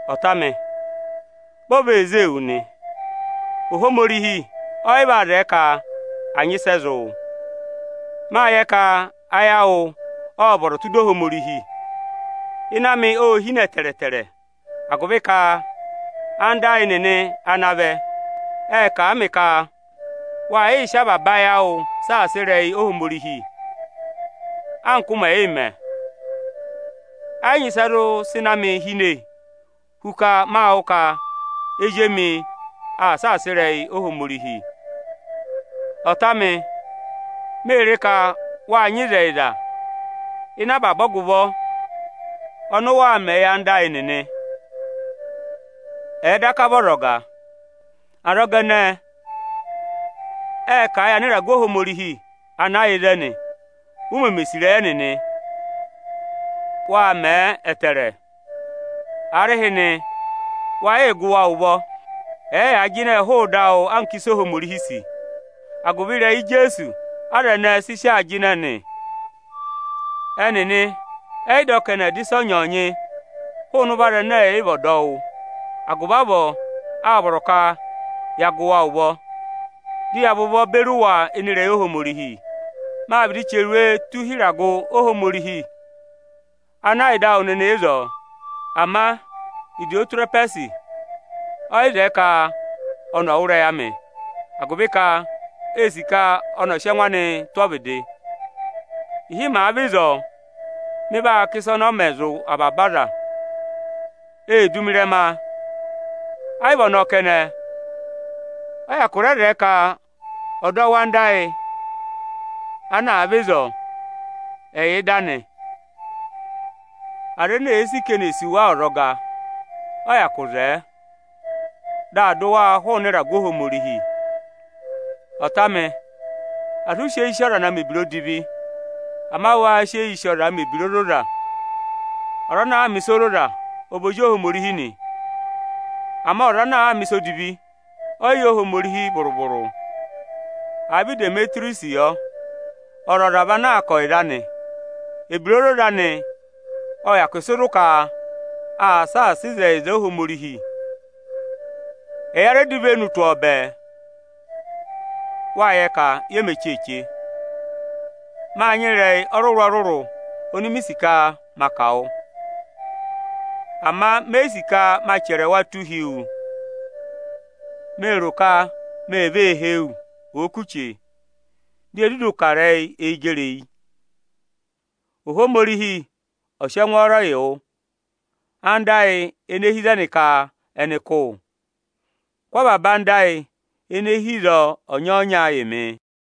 Ọta amị ọnị mị sì ịrẹyị anị; Ví o vee zée yị wu nị, Ohomorihi ọ yị vaa zẹẹ ka à nyị ịsị ẹ zị wụ. Mâ yẹ ka ayị awụ ộ vọrọ tụ́ ịdị Ohomorihi. Ịnẹ amị ô hine ẹtẹẹtẹrẹ agụvị ka anda ayị nịnị ana vẹ, ệ kà a mị ka waa yịị sị avaba ayị awụụ saasa ịrẹyị Ohomorihi anka ụụ̄ mẹ̀ yịị mẹ. Ẹ yị nyị ịsị ẹ zụ sị ịnẹ amị hine hu ka ma wụ́ ka ezi emi aa saasa ịrẹyị Ohomorihi. Ọta amị, mée re ka wáa nyị ịzẹyịza ịnị avaba ọgụvọ ọnị ụ waa mẹ̀ẹ yị anda ayị nịnị, ẹ̀ẹ daka vị ọzọga. Azọga ẹnẹẹ ệ kà a yị anịragụ Ohomorihi ana yà ịzẹnị ụ mẹmẹ sì ịrẹyị ẹnịnị. Wâ mẹẹ ẹtẹẹrẹ. Aarịhịnị wa yịị gụ wa ụvọ, ẹ̀ẹ yaa jịnẹ hụụ ịdị awụ anka ịsị Ohomorihi sì. Agụvị ịrẹyị Ijeesu aza ẹnẹẹ sị sị aa jịnẹ nị. Ẹnịnị ẹ́ yị dọ ka ẹnị ẹ̀ dọ ịsọnyị-ịsọnyị hụụnị ụvọ aza ẹnẹ ẹ̀ yị vị ọdọwụ. Agụvị avọọ, áa vọrọ ka ya gụ wa ụvọ, dị ya và ụvọ beri wa ịnị ịrẹyị Ohomorihi nị. Mâ vịdị chẹrẹ iwe tụ́ hi ịragụ Ohomorihi ana yà ịdị awụ nịnị ịzọọ, ama Ịdịyọtịrẹhwẹsị ọ yị zẹẹ ka ọnị ọ̀ wụ́ ịrẹyị amị, agụvị ka ee sì ka ọnị ọ̀ọ sị ẹngụ anịị tụ́ ọvịdị. Ịhị màa vẹ ịzọọ, mị vaa kà ịsa ọnị ọ mẹ zụ̀ avaba aza. Ee du mi ịrẹma. A yị vị ọnọọ kẹnẹ, ọ́ yị hyakụ rẹ zẹẹ ka ọdọwụ anda ayị ana àa vẹ ịzọọ, ẹ̀ yà ịdị anị. Aza ene èe sì ka eni è sì wa ọzọga, ọ́ yị hyakụ zẹẹ, dị aā dụ wa hụụnị ịragụ Ohomorihi. Ọta amị, asị ụ sị eyi sì ọza na mẹ̀ ebira odivi; ama waa sị eyii sì ọzaa mẹ̀ ebira ozoza! Ọza ana àa mẹ̀ ịsa ozoza, ọ vị ozi Ohomorihi nị; ama ọza ana àa mẹ̀ ịsa odivi ẹ́ yị yẹ Ohomorihi vụrụ-vụrụ. Àa vị Idemetiriyọsị yọ, ọzọza vị anaa kà ọyịza anị. Ebira ozoza anị ộ hyakụ sị zụ̀ ka aa saasa ịzẹyịza Ohomorihi. Ẹya rẹ dọ ivenu tụ́ ọ bẹẹ; wáa yẹ ka ye me cheeche. Mâ nyị ịrẹyị ọrụrụ-ọrụrụ oni mi sì ka ma kà wụ, ama me yi sì ka ma chẹrẹ wa tụ́ hi wu. Mée rò ka mee vee hee wu, òo kù chee, dị ye dudu kà ịrẹyị eyi gẹrị eyi. Ohomorihi ọ̀ sị ẹngwọọrọ yị wụ! Anda ayị ene hi ịzẹnị ka ẹnị kụ́ wụ. Kụ́ avaba anda ayị ene hi ịzọọ ọnya-ọnya yị mị!